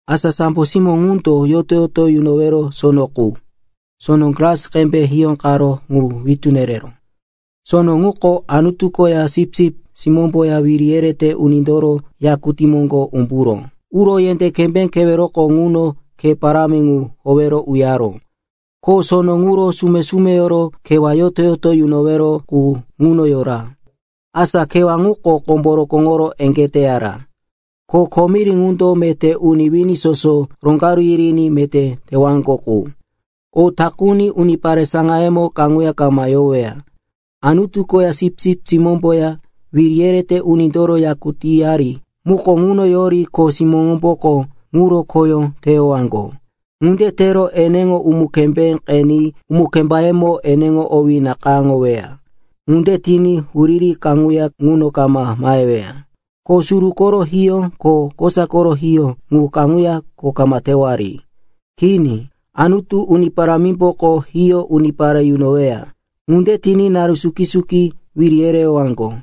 Asa sambo simó ŋundo yoto-yoto yunowero sono qu, sono glas qembe hiyóqaró ŋu witú nereró. Sono ŋuko Anutu koya Sipsip Simómboya wiri yerete unindoro yakutí moŋgo umburo uro yendé kembé keweroko ŋuno khe parámi ŋu howero uyaró. Ko sono ŋuro sume-sumeyoro kewá yoto-yoto yunowero qu ŋuno yora. Asa kewá ŋuko kombo rokóŋoro eŋgé teyara, ko komiri ŋundo meté uni wini soso roŋgaru yiriní meté tewaŋgo qu. O takuni unipare saŋayemo kaŋuya kama yoweya. Anutu koya Sipsip Simómboya wiri yerete unindoro yakutíyari muko ŋuno yori kho simóŋomboko ŋuro khoyó teyowaŋgo. Ŋunde tero eneŋo umu-kembé qeni umu-kembayemo eneŋo owí nakayáŋoweya. Ŋunde tiní huriri kaŋuya ŋuno kama maheweya, ko suru koro hiyó ko kosa koro hiyó ŋu kaŋuya kho kama tewari. Kini. Anutu, Uni Parámimboko hiyó unipare yunoweya. Ŋunde tiní naru suki-suki wiri yereyowaŋgo.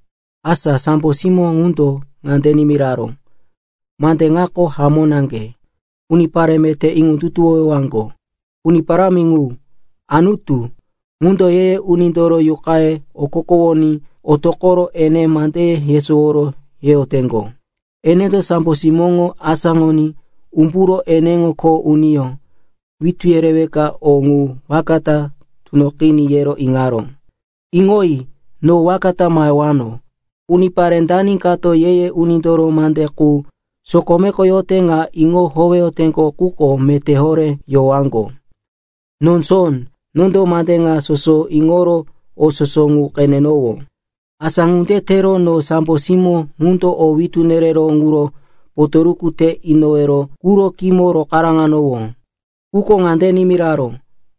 Asa sambo simó ŋundo ŋande nimiraró, “Mande ŋako hamó naŋge, unipare meté iŋondutuwowaŋgo. Uni Parámi ŋu, Anutu, ŋundo ye-ye unindoro yuqaye okokowoní otoqoro ene mande yesowo yeyoteŋgo. Enendo sambo simóŋo asáŋoní umburo ene kho uniyó, witú yereweka o ŋu waka ta tunoqiní, yero iŋaró. “Iŋoyi. No waka ta mahewano! Unipare dani kato ye-ye unindoro mande qu sokomeko yote ŋa iŋo howeyote quko meté horé yowaŋgo.” No Jon, nondo mande ŋa soso iŋoro o soso ŋu qenenowó. Asa ŋunde tero no sambo simó ŋundo o witú nereró ŋuro potoruku te inowero quro khímo rokaráŋanowó. Quko ŋande nimiraró,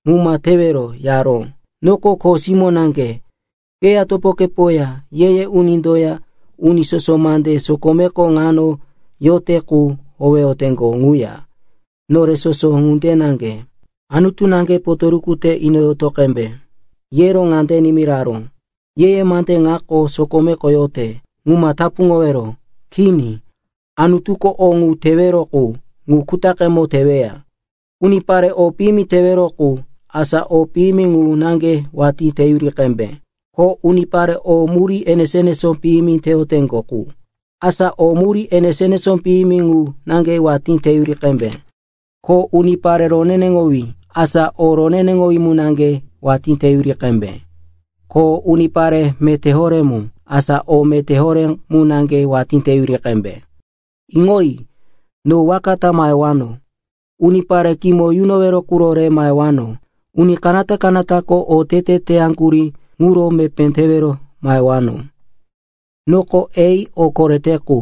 “Ŋu ma tewero!” yaró. “Noko kho simó naŋge, keya, topokepoya, ye-ye unindoya uni soso mande sokomeko ŋano yote qu howeyoteŋgo quya, nore soso ŋunde naŋge. Anutu naŋge potoruku te inoyoto qembe.” Yero ŋande nimiraró, “Ye-ye mande ŋako sokomeko yote, ŋu ma tapuŋowero. Kini. Anutuko o ŋu tewero qu, ŋu kutaqemo teweya. Unipare o piyimi teyoteŋgo qu, asa o piyimi ŋu naŋge watí teyuri qembe. Ko unipare o murí enesó-enesó piyimi teyoteŋgo qu, asa o murí enesó-enesó piyimi ŋu naŋge watí teyuri qembe. Ko unipare roneneŋowí, asa o roneneŋowí mu naŋge watí teyuri qembe. Ko unipare meté horé mu, asa o meté horé mu naŋge watí teyuri qembe.” “Iŋoyi. No waka ta mahewano. Unipare kimo yunowero ŋu re mahewano. Uni kanata-kanatako otete teyaŋgurí ŋuro mepé tewero mahewano. Noko A, o korete qu;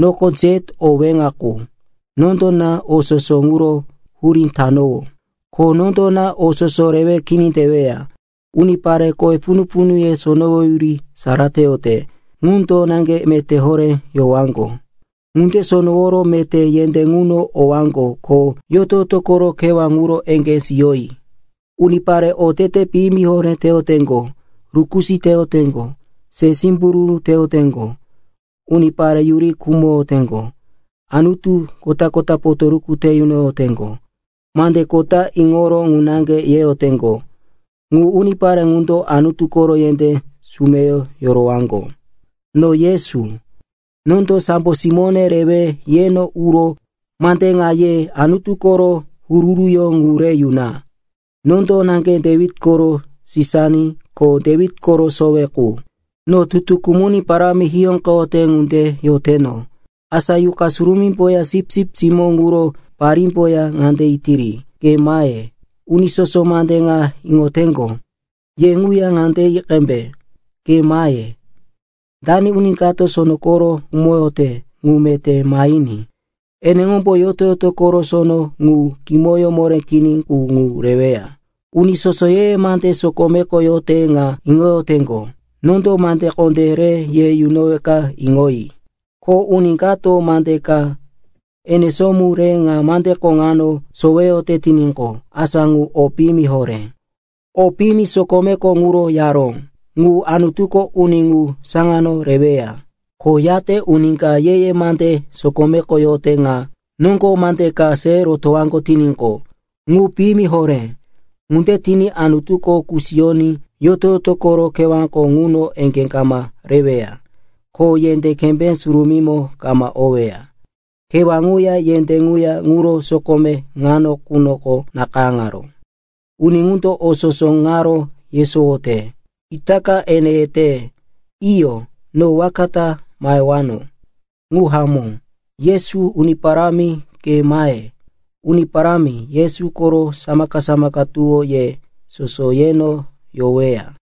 noko Z, o weŋa qu. Nondo na o soso ŋuro hurí tanowó, ko nondo na o soso rewe kini teweya. “Unipare kowe punu-punuye sonowoyuri sara teyote ŋundo naŋge meté horé yowaŋgo. Ŋunde sonoworo meté yendé ŋuno owaŋgo ko yoto-yoto koro kewá ŋuro eŋgé siyoyi. Unipare otete piyimi horé teyoteŋgo, rukusí teyoteŋgo, se simbururu teyoteŋgo, unipare yuri khumoyoteŋgo, anutu kota-kota potoruku te yunoyoteŋgo, mande kota iŋoro ŋu naŋge yeyoteŋgo, ŋu unipare ŋundo Anutu koro yendé sumeyo yorowaŋgo. “No Yesu, nondo sambo simóne rewe yeno uro mande ŋa ye Anutu koro huru-huruyó ŋu re yuna. Nondo naŋge Dewit koro Sisani ko Dewit koro Sowe qu. No Tutu Kumuní parámi hiyóqeyote ŋunde yoteno.” Asa Yuqa Surumímboya Sipsip Simó ŋuro parímboya ŋande yetiri, “Ke mahe.” Uni soso mande ŋa iŋoteŋgo, ye ŋuya ŋande yi qembe, “Ke mahe.” Dani uni kato sono koro khumoyote, ŋu meté mahiní. Eneŋombo yoto-yoto koro sono ŋu kimoyó moré kini qu ŋu reweya. “Uni soso ye-ye mande sokomeko yote ŋa iŋoyoteŋgo, nondo mande kondé re ye yunoweka iŋoyi. Ko uni kato mande ka enesó mu re ŋa mandeko ŋano soweyote tiníqo, asa ŋu o piyimi horé. O piyimi sokomeko ŋuro yaró, ŋu Anutuko uni ŋu saŋano reweya. Ko yate uni ka ye-ye mande sokomeko yote ŋa noŋgo mande ka se rotowaŋgo tiníqo, ŋu piyimi horé. Ŋunde tiní Anutuko kusiyoní yoto-yoto koro kewáko ŋuno eŋgé kama reweya, ko yendé kembé surumímo kama oweya. Kewá ŋuya yendé ŋuya ŋuro sokome ŋano qunoko nakayáŋaró.” Uni ŋundo o soso ŋaro yesowote, itaka ene yete, “Iyo, no waka ta mahewano.” Ŋu hamó. Yesu, Uni Parámi, ke mahe. Uni Parámi Yesu koro samaka-samaka tuwó ye soso yeno yoweya.